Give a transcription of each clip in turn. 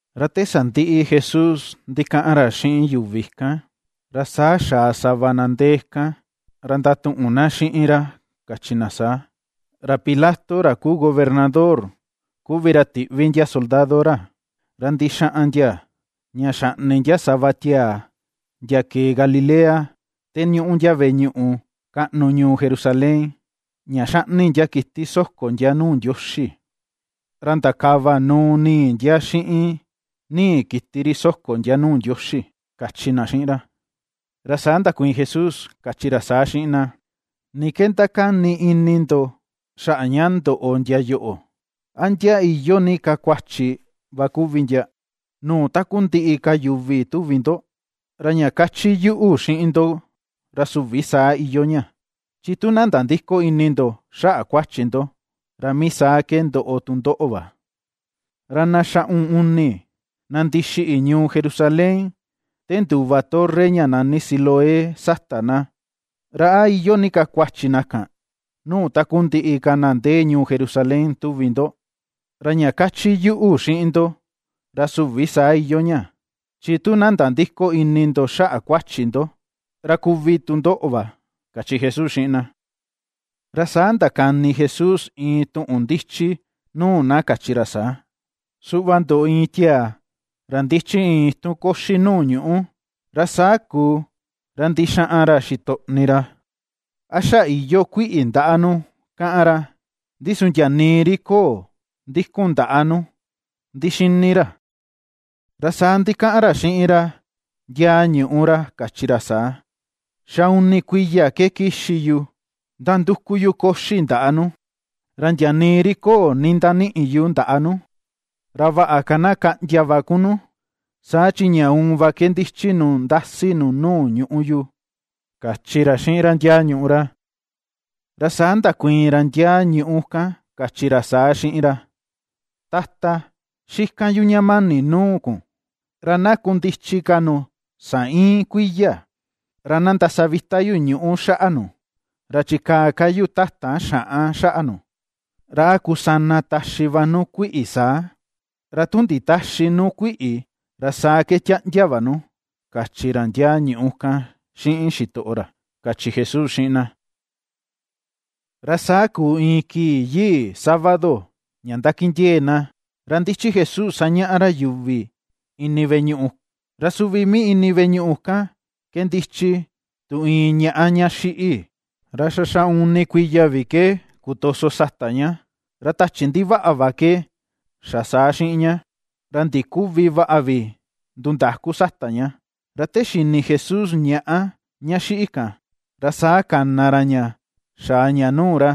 Ra te sandiꞌi Jesús ndikaꞌan ra xiꞌin yuvi kan. Ra saa xaa sava na ndee kan ra ndatuꞌun na xiꞌin ra kachi na saa: ―Ra Pilato ra kuu gobernador kuvi ra tiꞌvi ndia soldado ra, ra ndixaꞌan ndia ña xaꞌni ndia sava tiaa ndia kee Galilea te ñuꞌu ndia veꞌe ñuꞌu kaꞌnu ñuu Jerusalén ña xaꞌni ndia kiti soko ndia nuu Ndioxi. Ra ndakava nuu nii ndia xiꞌin nii kiti ri soko ndia nuu Ndioxi ―kachi na xiꞌin ra. Ra saa ndakuiin Jesús, kachi ra saa xiꞌin na: ―¿Ni ke ndakani ini ndo xaꞌa ña ndoꞌo ndia yoꞌo, a ndia iyoo ni ka kuachi va kuvi ndia nuu takundiꞌi ka yuvi tuvi ndo? Ra ña kachi yuꞌu xiꞌin ndo ra süvi saa iyoo ña. Chi tu na nandïko ini ndo xaꞌa kuachi ndo, ra mii saa ke ndoꞌo tu ndoꞌo va. Ra na xaꞌun uni na ndixiꞌi ñuu Jerusalén te nduva torre ña nani Siloé sata na, ¿ra a iyoo ni ka kuachi na kan, nuu takundiꞌi ka na ndee ñuu Jerusalén, tuvi ndo? Ra ña kachi yuꞌu xiꞌin ndo ra süvi saa iyoo ña. Chi tu na nandïko ini ndo xaꞌa kuachi ndo, ra kuvi tu ndoꞌo va ―kachi Jesús xiꞌin na. Ra saa ndakani Jesús iin tuꞌun ndichi nuu na kachi ra saa: ―Suꞌva ndoꞌo iin tiaa ra ndichi iin itun koxi nuu ñuꞌu, ra saa kuu ra ndixaꞌan ra xitoꞌni ra a xa iyoo kuiꞌi ndaꞌa nu, kaꞌan ra. Ndi su ndia nii ri köo ndikun ndaꞌa nu ndixini ra. Ra saa ndikaꞌan ra xiꞌin ra ndiaa ñuꞌu ra kachi ra saa: “Xa uni kuiya ke kixi yu nanduku yu koxi ndaꞌa nu. Ra ndia nii ri köo nindaniꞌi yu ndaꞌa nu. Ra vaꞌa ka na kaꞌndia va kun nu; saa chi ña uun va ke ndichi nu ndasi nu nuu ñuꞌu yu” ―kachi ra xiꞌin ra ndiaa ñuꞌu ra. Ra saa ndakuiin ra ndiaa ñuꞌu kan kachi ra saa xiꞌin ra: “Tata, xikan yu ña mani nuu kun, ra na kundichi ka nu saa iin kuiya; ra na ndasavita yu ñuꞌu xaꞌa nu, ra chikaa ka yu tatan xaꞌan xaꞌa nu. Ra a kusana taxi va nu kuiꞌi saa; ra tu nditäxi nu kuiꞌi ra saa ke tiaꞌndia va nu”, kachi ra ndiaa ñuꞌu kan xiꞌin xitoꞌo ra ―kachi Jesús xiꞌin na. Ra saa kuu iin kii yii sábado ña ndakindiee̱ na ra ndichi Jesús sañaꞌa ra yuvi ini veꞌe ñuꞌu; Ra suvi mii ini veꞌe ñuꞌu kan ke ndichi tu iin ñaꞌa ña xiꞌi, ra xa xaꞌun uni kuiya vi ke kutoso sata ña. Ra tachi ndivaꞌa va ke xa saa xiꞌin ña, ra ndiküvi vaꞌa vi nundaku sata ña. Ra te xini Jesús ñaꞌa ña xiꞌi kan, ra saa kana ra ña xaa ña nuu ra.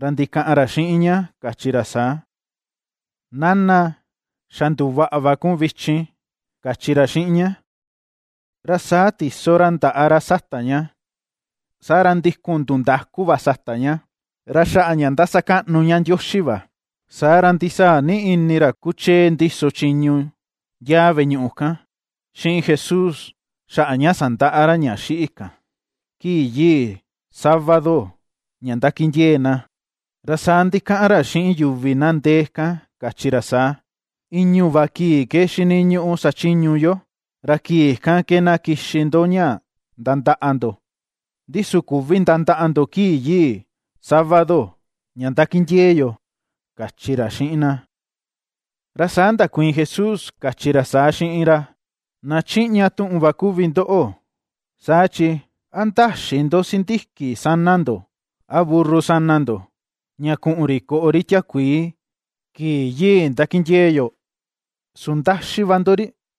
Ra ndikaꞌan ra xiꞌin ña kachi ra saa: ―Nana, xa nduvaꞌa va kun vichin ―kachi ra xiꞌin ña. Ra saa chindee ra ndaꞌa ra sata ña, saa ra ndikun ndundaku va sata ña, ra xaꞌa ña ^ndasakaꞌnu ña Ndioxi va. Saa ra ndisaa ni ini ra kuchee ndiso chiñu ndiaa veꞌe ñuꞌu kan xiꞌin Jesús xaꞌa ña sandaꞌa ra ña xiꞌi kan, kii yii sábado ña ndakindiee̱ na, ra saa ndikaꞌan ra xiꞌin yuvi na ndee kan kachi ra saa: ―I̱ñu̱ va kii ke xiniñuꞌu sachiñu yo, ra kii kan ke na kixi ndo ña nandaꞌa ndo. Ndi su küvi nandaꞌa ndo kii yii sábado ña ndakindiee yo ―kachi ra xiꞌin na. Ra saa ndakuiin Jesús, kachi ra saa xiꞌin ra: ―Na chiꞌña tuꞌun va kuvi ndoꞌo, saa chi, ¿a ndäxi ndo sindiki sana ndo a burru sana ndo ña kuꞌun ri koꞌo ri tiakuii kii yii ndakindiee̱ yo, su ndaxi va ndo ri?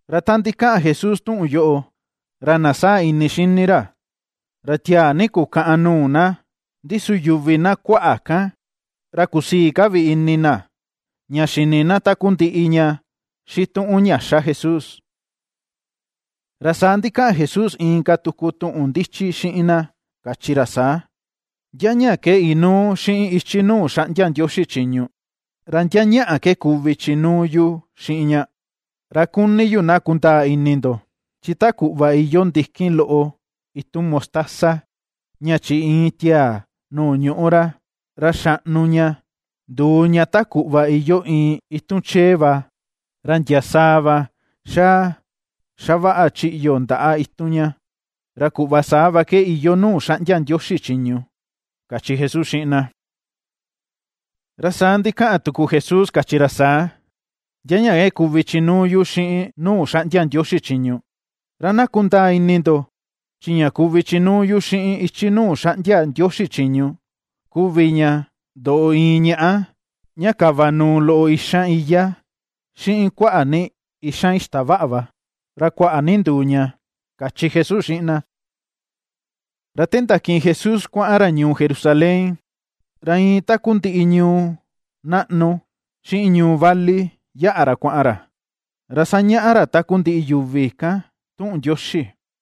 Ra ta ndikaꞌan Jesús tuꞌun yoꞌo, ra na saa ini xini ra, ra tiaa ni kukaꞌan nuu na; ndi su yuvi na kuaꞌa kan, ra kusii ka vi ini na ña xini na takundiꞌi ña xituꞌun ña xa Jesús. Ra saa ndikaꞌan Jesús inka tuku tuꞌun ndichi xiꞌin na kachi ra saa: ―¿Ndia ña ke inuu xiꞌin ichi nuu xaꞌndia Ndioxi chiñu, ra ndia ñaꞌa ke kuvi chinuu yu xiꞌin ña? Ra kuni yu na kundaa ini ndo, chi ta kuꞌva iyoo ndikin loꞌo itun mostaza ña chiꞌi iin tiaa nuu ñuꞌu ra, ra xaꞌnu ña nduu ña ta kuꞌva iyoo iin itun chee va, ra ndia sàà va xaa xavaꞌa chiꞌyo ndaꞌa itun ña, ra kuꞌva saa va ke iyoo nuu xaꞌndia Ndioxi chiñu ―kachi Jesús xiꞌin na. Ra saa ndikaꞌan tuku Jesús kachi ra saa: ―¿Ndia ña ke kuvi chinuu yu xiꞌin nuu xaꞌndia Ndioxi chiñu? Ra na kundaa ini ndo chi ña kuvi chinuu yu xiꞌin ichi nuu xaꞌndia Ndioxi chiñu kuvi ña ndoꞌo iin ñaꞌa ña kavanuu loꞌo ixan iyá xiꞌin kuaꞌa ni ixan ixtavaꞌa va, ra kuaꞌa ni nduu ña ―kachi Jesús xiꞌin na. Ra te ndakiꞌin Jesús kuaꞌan ra ñuu Jerusalén, ra iin takundiꞌi ñuu naꞌnu xiꞌin ñuu vali yaꞌa ra kuaꞌan ra, ra sañaꞌa ra takundiꞌi yuvi kan tuꞌun Ndioxi.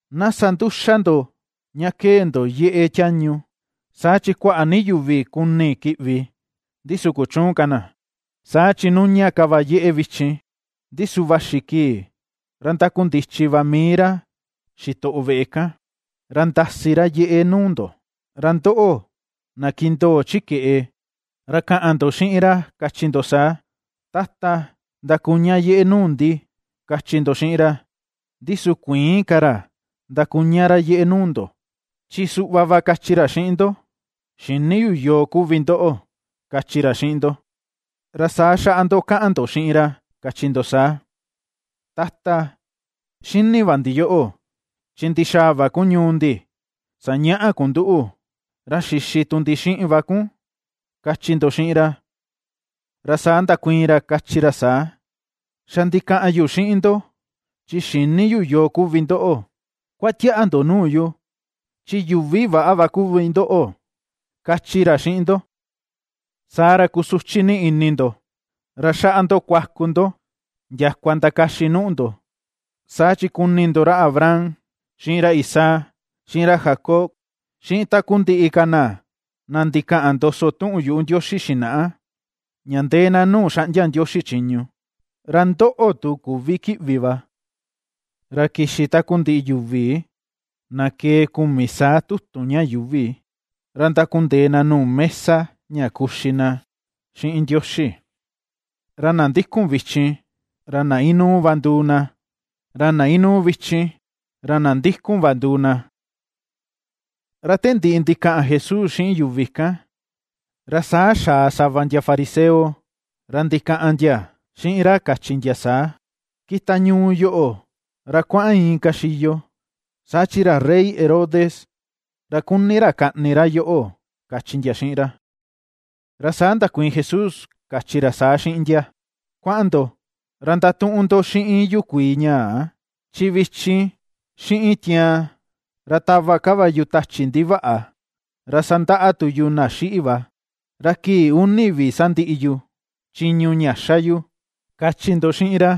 ―Na sa nduxa ndo ña kee ndo yeꞌe tiañu; saa chi kuaꞌa ni yuvi kuni kiꞌvi, ndi su kuchüun ka na. Saa chi nuña ka va yeꞌe vichin, ndi su vaxi kii ra ndakundichi va mii ra xitoꞌo veꞌe kan ra ndasi ra yeꞌe nuu ndo. Ra ndoꞌo, na kindoo chi keꞌe; ra kaꞌan ndo xiꞌin ra kachi ndo saa: “Tata, ndakuña yeꞌe nuu ndi”, kachi ndo xiꞌin ra. Ndi su kuïin ka ra ndakuña ra yeꞌe nuu ndo, chi suꞌva va kachi ra xiꞌin ndo: “Xïni yu yoo kuvi ndoꞌo”, kachi ra xiꞌin ndo. Ra saa xaꞌa ndo kaꞌan ndo xiꞌin ra, kachi ndo saa: “Tata, xini va ndi yoꞌo chi ndixaa va kun ñuu ndi sañaꞌa kun nduꞌu, ra xixi tu ndi xiꞌin va kun”, kachi ndo xiꞌin ra. Ra saa ndakuiin ra kachi ra saa: “Xa ndikaꞌan yu xiꞌin ndo, chi xïni yu yoo kuvi ndoꞌo. Kuatiaꞌa ndo nuu yu, chi yuvi väꞌa va kuvi ndoꞌo”, kachi ra xiꞌin ndo. Saa ra kusuchi ni ini ndo, ra xaꞌa ndo kuaku ndo ndiakua ndakaxi nuu ndo. Saa chi kuni ndo ra Abraham xiꞌin ra Isaac, xiꞌin ra Jacob, xiꞌin takundiꞌi ka na na ndikaꞌan ndoso tuꞌun yuꞌu Ndioxi xinaꞌa, ña ndee na nuu xaꞌndia Ndioxi chiñu. Ra ndoꞌo tu, küvi kiꞌvi va. Ra kixi takundiꞌi yuvi na kee kumi saa tutun ña yuuvi ra ndakundee na nuu mesa ña kuxi na xiꞌin Ndioxi. Ra na ndikun vichin ra na inuu va nduu na, ra na inuu vichin ra na ndikun va nduu na. Ra te ndiꞌi ndikaꞌan Jesús xiꞌin yuvi kan, ra saa xaa sava ndia fariseo ra ndikaꞌan ndia xiꞌin ra kachi ndia saa: ―Kita ñuu yoꞌo ra kuaꞌan inka xiyo, saa chi ra rey Herodes ra kuni ra kaꞌni ra yoꞌo ―kachi ndia xiꞌin ra. Ra saa ndakuiin Jesús kachi ra saa xiꞌin ndia: ―Kuaꞌan ndo ra ndatuꞌun ndo xiꞌin yukuii ñaa, chi vichin xiꞌin tiaan ra tava ka va yu tachi ndivaꞌa ra sandaꞌa tu yu na xiꞌi va, ra kii uni vi sandiꞌi yu chiñu ña xa yu, kachi ndo xiꞌin ra.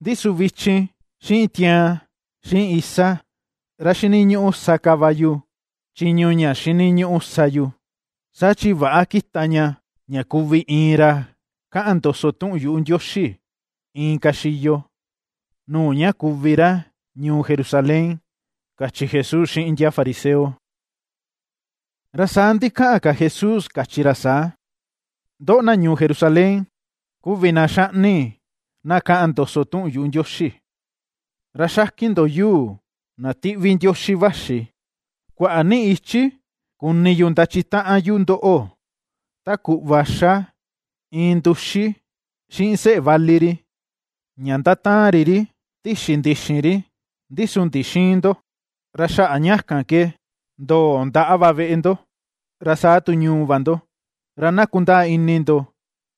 Ndi su vichin, xiꞌin tiaan, xiꞌin isa, ra xiniñuꞌu sa ka va yu chiñu ña xiniñuꞌu sa yu, saa chi väꞌa kita ña ña kuvi iin ra kaꞌan ndoso tuꞌun yuꞌu Ndioxi inka xiyo nuu ña kuvi ra ñuu Jerusalén ―kachi Jesús xiꞌin ndia fariseo. Ra saa ndikaꞌan ka Jesús kachi ra saa: ―¡Ndoꞌo, na ñuu Jerusalén, kuvi na ^xaꞌni na kaꞌan ndoso tuꞌun yuꞌu Ndioxi, ra xakin ndo yuu na tiꞌvi Ndioxi vaxi! ¡Kuaꞌa ni ichi kuni yu ndachitaꞌan yu ndoꞌo, ta kuꞌva ^xa iin nduxi xiꞌin seꞌe vali ri ña ^ndataan ri ri tixi ndixin ri, ndi su ndixïin ndo! Ra xaꞌa ña kan ke ndoo ndaꞌa va veꞌe ndo, ra sa tu ñuu va ndo, ra na kundaa ini ndo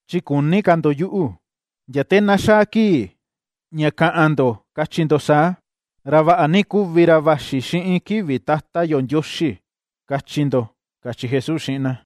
chi küni ka ndo yuꞌu, ndia te na xaa kii ña kaꞌan ndo kachi ndo saa: “Ra vaꞌa ni kuvi ra vaxi xiꞌin kivi Tata yo Ndioxi”, kachi ndo ―kachi Jesús xiꞌin na.